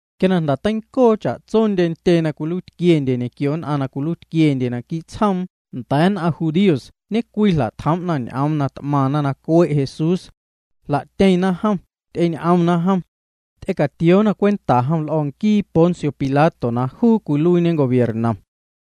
Quia na jnda̱ teincoo cha'tso ntyee na cwiluiitquiendye ñequio nn'aⁿ na cwiluiitquiendye quii' tsjoom nda̱a̱ nn'aⁿ judíos ñe'cwii jla'tjoom'na ñ'oom na t'maⁿna cue' Jesús. Jla'tyeⁿna jom, ty'eñ'omna jom. Ty'ecatioona cwenta jom l'o̱ nquii Poncio Pilato na juu cwiluiiñe gobiernom.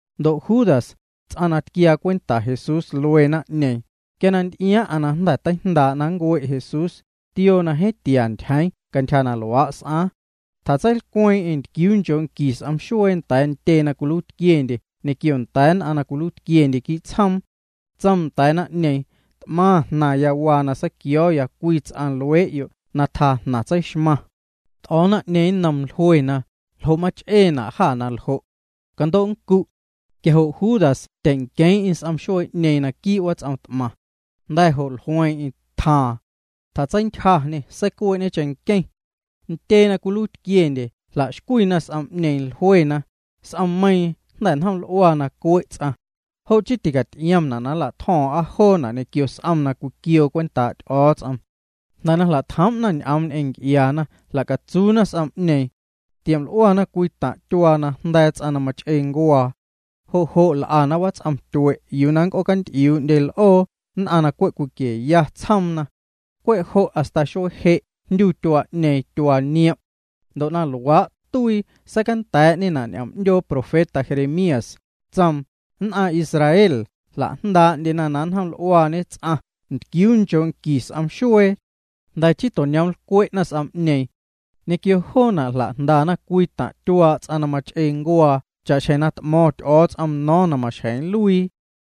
Ndo' Judas, ts'aⁿ na tquiaa cwenta Jesús luee naⁿ'ñeeⁿ, quia na nty'iaaⁿ'aⁿ na jnda̱ teijndaa' na nncue' Jesús, tioo na jeeⁿ tia ntyjeeⁿ cantyja na s'aaⁿ. Tjatseilcweeⁿ'eⁿ ntquiuu nchoo' nqui s'om xuee nda̱a̱ ntyee na cwiluiitquiendye ñequio nda̱a̱ nn'aⁿ na cwiluiitquiendye quii' tsjoom. Tsoom nda̱a̱ naⁿ'ñeeⁿ: —T'maⁿ jnaⁿya waa na seiquio̱o̱ya cwii ts'aⁿ luee'yo' na tjaa'naⁿ jnaⁿ tseixmaⁿ. T'o̱o̱ naⁿ'ñeeⁿ nnoom, jluena: —¿Ljo' mach'eena' jâ na ljo'? Cando' nncu'. Quia jo' Judas tyeⁿnqueeⁿ'eⁿ s'om xuee'ñeeⁿ naquii' wats'om t'maⁿ. Jnda̱ jo' jlueeⁿ'eⁿ, tjaaⁿ. Tjatseintyjañê, seicuee'ñe cheⁿnqueⁿ. Ntyee na cwiluiitquiendye jla'xcwiina s'om'ñeeⁿ. Jluena: —S'ommeiiⁿ jnda̱ njoml'ua na nncue' ts'aⁿ. Jo' chii ticaty'iomyana' na nlatjo̱o̱ⁿ'a joona' ñequio s'om na cwiquioo cwentaa' Ty'o̱o̱ts'om. Jnda̱ na jla'tjoom'na ñ'oom ñ'eⁿ nc'iaana, jla'catsuuna s'om'ñeeⁿ. Tioml'uana cwii taⁿ' tyuaa na jnda̱a̱ ts'aⁿ na mach'ee ncuaa. Jo' jo' l'ana wats'om tyue' yuu na nnc'oocaty'iuuna l'oo, nn'aⁿ na cwe' cwiquieya tsjoomna. Cwe' jo' hasta xuee je' jndyu tyuaa'ñeeⁿ Tyuaa Niom'. Ndo' na luaa' tuii seicanda̱a̱'ñena' ñ'oom 'ndyoo profeta Jeremías, tsoom: “Nn'aⁿ Israel jla'jndaa'ndyena na njoml'uañe ts'aⁿ ntquiuu nchoo' nqui s'om xuee. Jnda̱ chii to'ñoomlcwe'na s'om'ñeeⁿ. Ñequio joona' jla'jndana cwii taⁿ' tyuaa' ts'aⁿ na mach'ee ncuaa cha'xjeⁿ na t'mo̱ⁿ Ty'o̱o̱ts'om no̱o̱ⁿ na maxjeⁿ nluii.”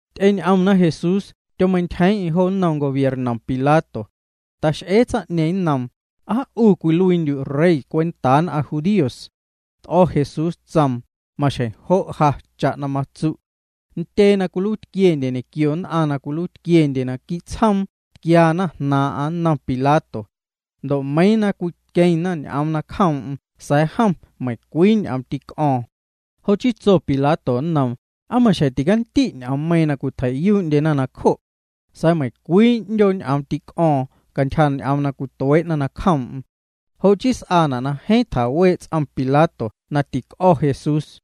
Ty'eñ'omna Jesús, tyomeintyjeeⁿ'eⁿ jo nnom gobiernom Pilato. Tax'ee tsaⁿ'ñeeⁿ nnoom: —¿Aa 'u cwiluiindyu' Rey cwentaa nn'aⁿ judíos? T'o̱ Jesús, tsoom: —Maxjeⁿ jo' ja, cha'na matsu'. Ntyee na cwiluiitquiendye ñequio nn'aⁿ na cwiluiitquiendye quii' tsjoom tquiana jnaaⁿ'aⁿ nnom Pilato. Ndo' meiiⁿ na cwiqueⁿna ñ'oom nacjoom'm sa̱a̱ jom meiⁿcwii ñ'oom tîc'o̱o̱ⁿ. Jo' chii tso Pilato nnoom: —¿Aa maxjeⁿ ticandi' ñ'oommeiiⁿ na cwitjei'yuu'ndyena nacjo'? Sa̱a̱ meiⁿcwii 'ndyoo ñ'oom tîc'o̱o̱ⁿ cantyja ñ'oom na tuee'na nacjoom'm. Jo' chii s'aana' na jeeⁿ tjawee' ts'om Pilato na tîc'o̱ Jesús.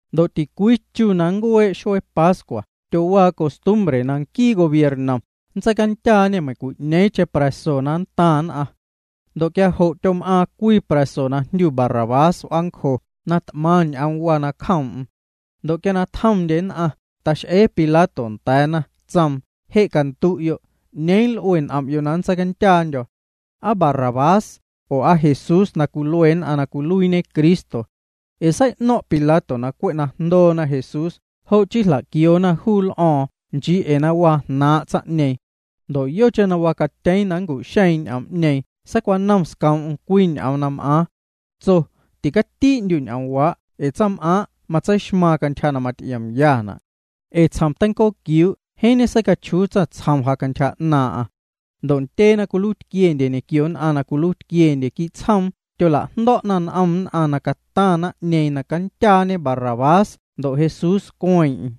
Ndo' ticwii chu na nncuee' xuee pascua tyowaa costumbre na nquii gobiernom nntseicandyaañê meiⁿcwi'ñeeⁿcheⁿ pra̱so na nntaⁿ nn'aⁿ. Ndo' quia jo' tyom'aaⁿ cwii pra̱so na jndyu Barrabás w'aancjo na t'maⁿ ñ'oom waa nacjoom'm. Ndo' quia na tjomndye nn'aⁿ, tax'ee Pilato nda̱a̱na, tsoom: —Je' candu'yo', ¿'ñeeⁿ juu l'ue n'om'yo' na nntseicandyaandyo̱? ¿Aa juu Barrabás, oo ¿aa Jesús na cwilue nn'aⁿ na cwiluiiñe Cristo? Ee sei'no̱ⁿ' Pilato na cwe' na jndoona Jesús jo' chii jla'quioona juu l'o̱o̱ⁿ nchii ee na waa jnaaⁿ' tsaⁿ'ñeeⁿ. Ndo' yocheⁿ na wacatyeeⁿ na nncu'xeeⁿ ñ'oom'ñeeⁿ seicwanom scoom'm cwii ñ'oom na m'aaⁿ. Tso: “Ticatii'ndyu' ñ'oomwaa' ee tsaⁿm'aaⁿ' matseixmaaⁿ cantyja na maty'iomyana'. Ee tsjom teincooquiuu' jeeⁿ ñeseicachjuu tsaⁿtsjom ja cantyja 'naaⁿ'aⁿ.” Ndo' ntyee na cwiluiitquiendye ñequio nn'aⁿ na cwiluiitquiendye quii' tsjoom tyola'jndo̱'na n'om nn'aⁿ na cataⁿ naⁿ'ñeeⁿ na candyaañe juu Barrabás ndo' Jesús cueeⁿ'eⁿ.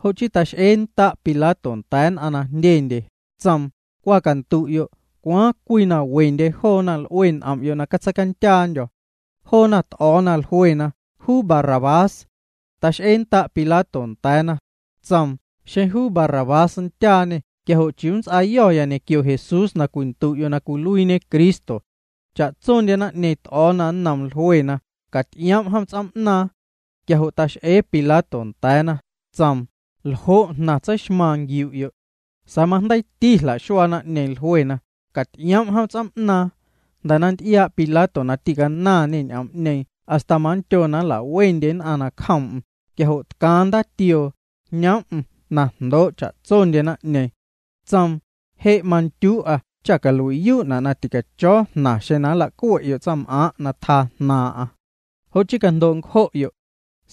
Jo' chii tax'eennda' Pilato nda̱a̱ nn'aⁿ na jndyendye, tsoom: —Cwa candu'yo', ¿cwaaⁿ cwii na wendye joona l'ue n'om'yo' na catseicandyaandyo̱? Joona t'o̱o̱na, jluena: —Juu Barrabás. Tax'eennda' Pilato nda̱a̱na. Tsoom: —Xeⁿ juu Barrabás nndyaañê quia jo' ¿chiuu nnts'aayo̱ ñequio Jesús na cwindu'yo' na cwiluiiñe Cristo? Cha'tsondye naⁿ'ñeeⁿ t'o̱o̱na nnoom, jluena: —Caty'ioom' jom ts'oom'naaⁿ. Quia jo' tax'ee Pilato nda̱a̱na, tsoom: —¿Ljo' jnaⁿ tseixmaaⁿ nquiu'yo'? Sa̱a̱ majndeiiti jla'xuaa naⁿ'ñeeⁿ, jluena: —Caty'ioom' jom ts'oom'naaⁿ. Jnda̱ na nty'iaa' Pilato na tîcanaⁿñê ñ'oom'ñeeⁿ hasta manndyo na nla'wendyena nacjoom'm, quia jo' tcaaⁿ ndaatioo, jñoom'm na jndoo' cha'tsondye naⁿ'ñeeⁿ. Tsoom: —Je' mandyuu'a cha calui'yuu'na' na ticacho̱o̱ jnaⁿ xeⁿ nlacue'yo' tsaⁿm'aaⁿ' na tjaa jnaaⁿ'. Jo' chii, cajndo' ncjo'yo'.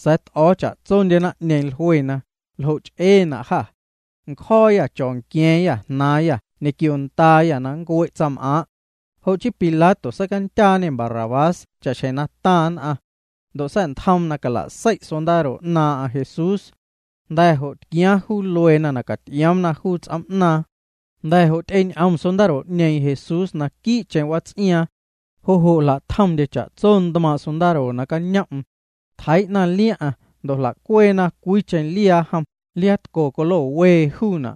Sa̱a̱ t'o̱o̱ cha'tsondye naⁿ'ñeeⁿ, jluena: —Ljo' ch'eena' jâ. Ncjo̱o̱yâ nncho̱o̱nqua̱a̱ⁿyâ jnaⁿ ñequio ndaayâ na nncue' tsaⁿm'aaⁿ'. Jo' chii Pilato seicandyaañê Barrabás cha'xjeⁿ na taⁿ nn'aⁿ. Ndo' sa̱'ntjoom na cala'sei' sondaro 'naaⁿ'aⁿ Jesús. Jnda̱ jo' tquiaaⁿ juu lueena na caty'ioomna juu ts'oom'naaⁿ. Jnda̱ jo' ty'eñ'om sondaro'ñeeⁿ Jesús naquii'cheⁿ wats'iaaⁿ. Jo' jo' jla'tjomndye cha'tso ntmaaⁿ' sondaro nacañom'm. Tjeii'na liaⁿ'aⁿ ndo' jla'cweena cwiicheⁿ liaa jom, liaatco colo wee juuna'.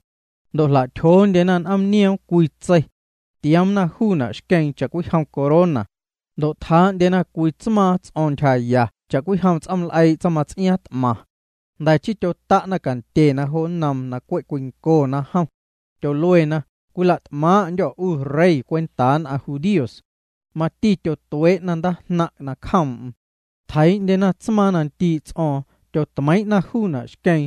Ndo' jla'tyjoondyena n'oomnioom cwii tsei. Tioomna juuna' xqueeⁿ cha'cwijom corona. Ndo' tjaa'ndyena cwii tsmaaⁿ ts'o̱o̱ⁿ ntyjaya cha'cwijom ts'ooml'eii' tsaⁿmats'iaaⁿ t'maⁿ. Jnda̱ chii tyota'na cantyena jo nnoom na cwe' cwincona jom. Tyoluena: —Cwila't'maaⁿ'ndyô̱ 'u Rey cwentaa nn'aⁿ judíos. Mati tyotuee'na ndaajnaⁿ' cjoom'm. Tjeii'ndyena tsmaaⁿ na ndii' ts'o̱o̱ⁿ, tyotmeiiⁿ'na juuna' xqueeⁿ.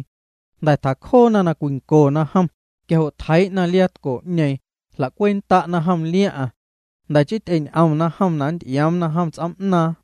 Jnda̱ tjacjoona na cwincona jom, quia jo' tjeii'na liaatco'ñeeⁿ, jla'cweennda'na liaⁿ'aⁿ jom. Jnda̱ chii ty'eñ'omna jom na nnty'ioomna jom ts'oom'naaⁿ.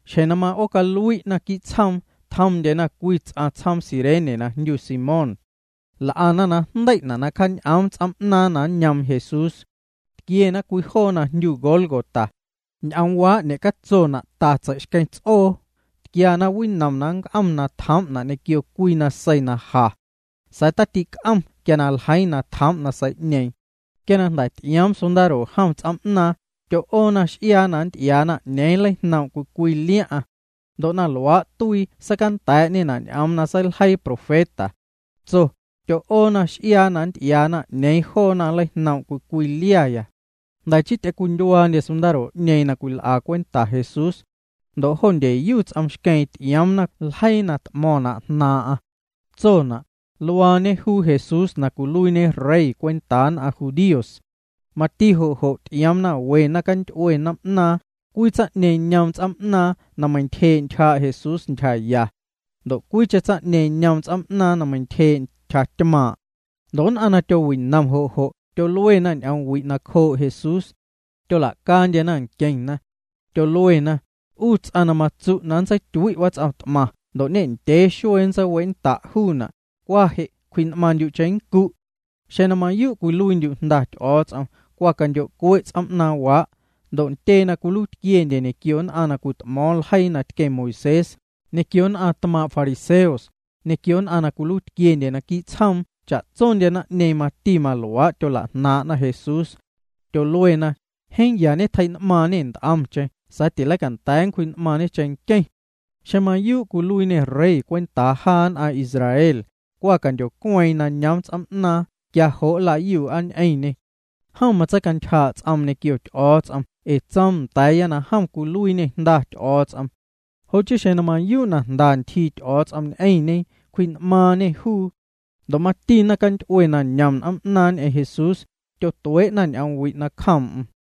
Xjeⁿ na ma'oocalui'na quii' tsjoom, tjomndyena cwii ts'aⁿ tsjoom Cirene na jndyu Simón. L'ana na jndei'na' na cjaañ'oom ts'oom'naaⁿ na nñoom Jesús. Tquiena cwii joo na jndyu Gólgota. Ñ'oomwaa' ñecatsona' Ta Tsei'xqueⁿ Ts'oo. Tquiana winom na nnc'om na tjoom'na' ñequio cwii nasei na ja. Sa̱a̱ tatic'om quia ljeiiⁿ na tjoom' nasei'ñeeⁿ. Ndo' quia jnda̱ ty'ioom sondaro jom ts'oom'naaⁿ, tyo'oona x'iaa na nnty'iaana 'ñeeⁿ nleijnoom' cwii cwii liaⁿ'aⁿ. Ndo' na luaa' tuii seicanda̱a̱'ñena' ñ'oom na seiljeii profeta. Tso: “Tyo'oona x'iaa na nnty'iaana 'ñeeⁿ joona nleijnoom' cwii cwii liaya.” Jnda̱ chii ty'ecwindyuaandye sondaro'ñeeⁿ na cwil'ana cwenta Jesús. Ndo' jo ndyeyu ts'om xqueeⁿ ty'ioomna ljeii na t'mo̱ⁿna' jnaaⁿ'aⁿ. Tsona': “Luaañe juu Jesús na cwiluiiñe Rey cwentaa nn'aⁿ judíos.” Mati jo' jo' ty'ioomna we naⁿcanty'ue n'oom'naaⁿ, cwii tsaⁿ'ñeeⁿ ñoom ts'oom'naaⁿ na meintyjee' ntyjaa' Jesús ntyjaya. Ndo' cwiicheⁿ tsaⁿ'ñeeⁿ ñoom ts'oom'naaⁿ na meintyjee' ntyjatymaaⁿ'. Ndo' nn'aⁿ na tyowinom jo' jo' tyoluena ñ'omwi' nacjoo' Jesús. Tyola'caandyena nqueⁿna. Tyoluena: —'U ts'aⁿ na matsu' na nntseityui' wats'om t'maⁿ ndo' ñendyee xuee nntseiwe'nnda' juuna', cwa je' cwji'n'maaⁿndyu' cheⁿnncu'. Xeⁿ mayuu' na cwiluiindyu' Jnda Ty'o̱o̱ts'om, cwa candyo'cue' ts'oom'naaⁿwaa'. Ndo' ntyee na cwiluiitquiendye ñequio nn'aⁿ na cwit'mo̱o̱ⁿ ljeii na tqueⁿ Moisés, ñequio nn'aⁿ tmaaⁿ' fariseos, ñequio nn'aⁿ na cwiluiitquiendye naquii' tsjoom cha'tsondye naⁿ'ñeeⁿ mati maluaa' tyola'jnaaⁿ'na Jesús. Tyoluena: —Jeeⁿ ya ñetjei'n'maaⁿñê nt'omcheⁿ sa̱a̱ tileicanda̱a̱ nncwji'n'maaⁿñe cheⁿnqueⁿ. Xeⁿ mayuu' na cwiluiiñê Rey cwentaa jaa nn'aⁿ Israel, cwa candyocueeⁿ na nñoom ts'oom'naaⁿ quia jo' nlayuu'a ñ'eⁿñê. Jom matseicantyjaa' ts'oom ñequio Ty'o̱o̱ts'om ee tsoom nda̱a̱ya na jom cwiluiiñê Jnda Ty'o̱o̱ts'om. Jo' chii xeⁿ na mayuu' na jnda ntyjii Ty'o̱o̱ts'om ñ'eⁿñe, cwji'n'maaⁿñê juu. Ndo' mati naⁿcanty'ue na ñom n'oom'naaⁿ ñ'eⁿ Jesús, tyotuee'na ñ'omwi' nacjoom'm.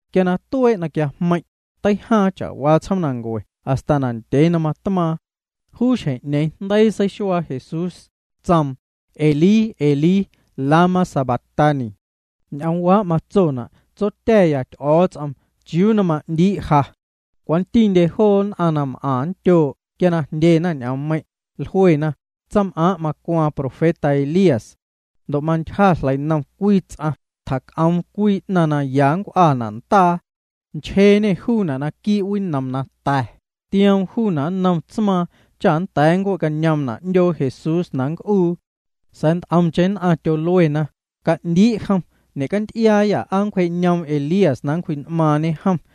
Quia na tuee' na quiajmeiⁿ', teijaaⁿ cha'waa tsjoomnancue hasta na ndyee na matmaaⁿ. Juu xjeⁿ'ñeeⁿ jndeii seixuaa Jesús, tsoom: —Elí, Elí, lama sabactani. (Ñ'oomwaa' matsona': Tsotya̱ya Ty'o̱o̱ts'om, ¿chiuu na ma'ndii' ja?) Cwantindye joo nn'aⁿ na m'aⁿ nndyoo' quia na jndyena ñ'oommeiⁿ', jluena: —Tsaⁿm'aaⁿ' macwaaⁿ profeta Elías. Ndo' mantyja jleinom cwii ts'aⁿ, tjac'oom cwii 'naⁿ na ya maw'ana' ndaa. Nchjeeñê juuna' naquii' winom na ta̱, tioom juuna' nnom tsmaaⁿ cha nnda̱a̱ nncue'cañoomna' 'ndyoo Jesús na nnc'uu. Sa̱a̱ nt'omcheⁿ nn'aⁿ tyoluena: —Ca'ndii' jom. Ñe'canty'iaayâ aa nncwje'cañoom Elías na nncwji'n'maaⁿñe jom.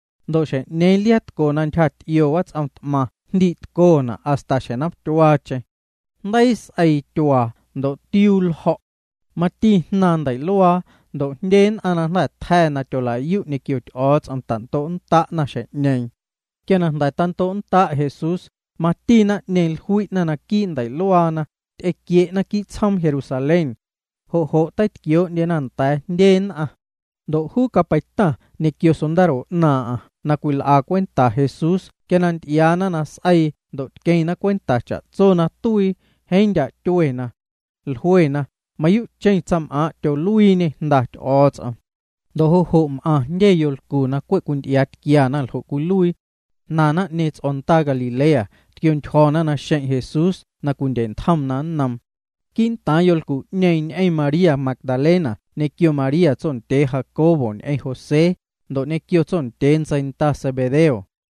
Ndo' xjeⁿ'ñeeⁿ liaatco na ntyjaty'io wats'om t'maⁿ jndii'tcona' hasta xjeⁿ nomtyuaacheⁿ. Jndeii s'eii tyuaa ndo' tiuu ljo̱'. Mati jnaaⁿ ndei'luaa ndo' jndye nn'aⁿ na jnda̱ tja̱ na tyola'yu' ñequio Ty'o̱o̱ts'om tando'nnda'na xjeⁿ'ñeeⁿ. Quia na jnda̱ tando'nnda' Jesús, mati naⁿ'ñeeⁿ jlui'na naquii' ndei'luaana, ty'equie'na quii' tsjoom Jerusalén. Jo' jo' teitquioo'ndyena nda̱a̱ jndye nn'aⁿ. Ndo' juu capeitaⁿ ñequio sondaro 'naaⁿ'aⁿ na cwil'a cwenta Jesús quia na nty'iaana na s'eii ndo' tqueⁿna cwenta cha'tso na tuii, jeeⁿ ndya' tyuena. Jluena: —Mayuu'cheⁿ tsaⁿm'aaⁿ' tyoluiiñê Jnda Ty'o̱o̱ts'om. Ndo' jo' jo' m'aⁿ jndye yolcu na cwe' cwinty'iaatquiana ljo' cwiluii. Jnaⁿ naⁿ'ñeeⁿ ts'o̱ndaa Galilea, tquiontyjo̱na naxeⁿ' Jesús na cwindye'ntjomna nnoom. Quii'ntaaⁿ yolcu'ñeeⁿ ñ'eⁿ María Magdalena ñequio María tsondyee Jacobo ñ'eⁿ José, ndo' ñequio tsondyee ntseinda Zebedeo.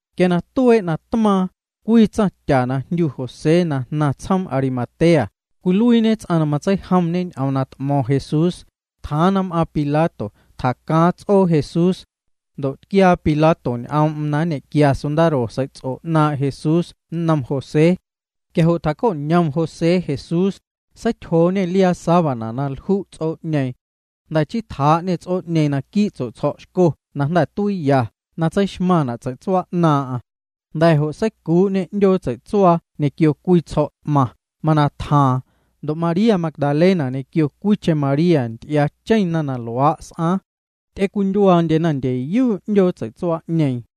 Quia tuee' na tmaaⁿ, cwii tsaⁿtya na jndyu José na jnaⁿ tsjoom Arimatea, cwiluiiñe ts'aⁿ na matseijomñe ñ'oom na t'mo̱ⁿ Jesús, tjaaⁿ na m'aaⁿ Pilato, tjacaaⁿ ts'oo Jesús. Ndo' tquiaa Pilato ñ'oom'm na nñe'quia sondaro sei'ts'o 'naaⁿ' Jesús nnom José. Quia jo' tjaco'ñom José Jesús, seityjooñê liaa sábana na lju' juu ts'oo'ñeeⁿ. Jnda̱ chii tjaa'ñê ts'oo'ñeeⁿ naquii' tsue'tsjo̱' xco na jnda̱ tuiiya na tseixmaⁿna' tsei'tsuaa 'naaⁿ'aⁿ. Jnda̱ jo' seicuu'ñê 'ndyoo tsei'tsuaa ñequio cwii tsjo̱' t'maⁿ, mana tjaaⁿ. Ndo' María Magdalena ñequio cwiicheⁿ María nty'iaacheⁿna na luaa' s'aaⁿ. Ty'ewindyuaandyena ndyeyu 'ndyoo tsei'tsuaa'ñeeⁿ.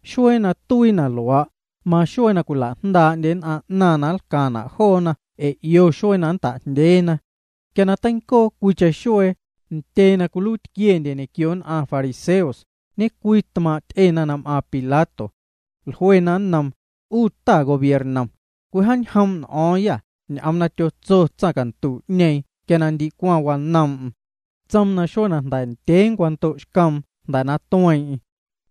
Xuee na tuii na luaa', maxuee na cwila'jndaa'ndye nn'aⁿ 'naⁿ na nlcaⁿna' joona ee na 'io xuee na nnta'jndyeena. Quia na teincoo cwiicheⁿ xuee, ntyee na cwiluiitquiendye ñequio nn'aⁿ fariseos, ñecwii tmaaⁿ' ty'ena na m'aaⁿ Pilato. Jluena nnoom: —'U ta gobiernom, cwijaañjoom' n'o̱o̱ⁿyâ ñ'oom na tyotso tsaⁿcantu'ñeeⁿ quia ndi wanoom'm. Tsoom na xuee jnda̱ ndyee nncwando'xcoom jnda̱ na tueeⁿ'eⁿ.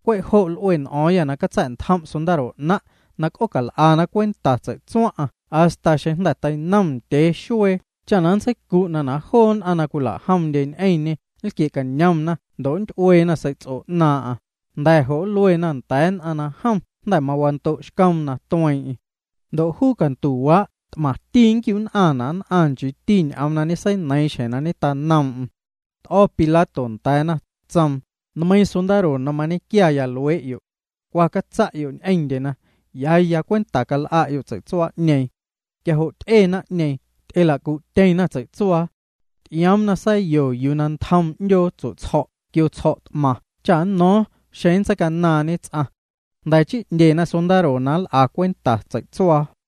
Cwe' jo' l'ue n'o̱o̱ⁿyâ na catsa̱'ntjom' sondaro 'naⁿ', na c'oocal'ana cwenta tsei'tsuaⁿ'aⁿ hasta xeⁿjnda̱ teinom ndyee xuee cha nntseicu'na' na joo nn'aⁿ na cwila'jomndye ñ'eⁿñê nlquie'cañomna ndo' nnty'ueena sei'ts'o 'naaⁿ'aⁿ, jnda̱ jo' nluena nda̱a̱ nn'aⁿ na jom jnda̱ mawando'xcoom na tueeⁿ'eⁿ. Ndo' juu cantuwaa' t'maⁿti nñequiu'nn'aⁿna' nn'aⁿ nchiiti ñ'oom na ñeseineiiⁿ xjeⁿ na ñetanoom'm. T'o̱ Pilato nda̱a̱na, tsoom: —Nmeiiⁿ sondaro na mañequia luee'yo'. Cwa catsa'yo' ñ'eⁿndyena. Ya ya cwenta cal'a'yo' tsei'tsuaa'ñeeⁿ. Quia jo' ty'e naⁿ'ñeeⁿ. Ty'ela'cu'tyeⁿna tsei'tsuaa. Ty'ioomna sa̱yo yuu na ntjom 'ndyoo tsue'tsjo̱' quio tsjo̱' t'maⁿ cha nno̱o̱ⁿ xeⁿ nntseicanaaⁿñe ts'aⁿ. Jnda̱ chii 'ndyena sondaro na nl'a cwenta tsei'tsuaa.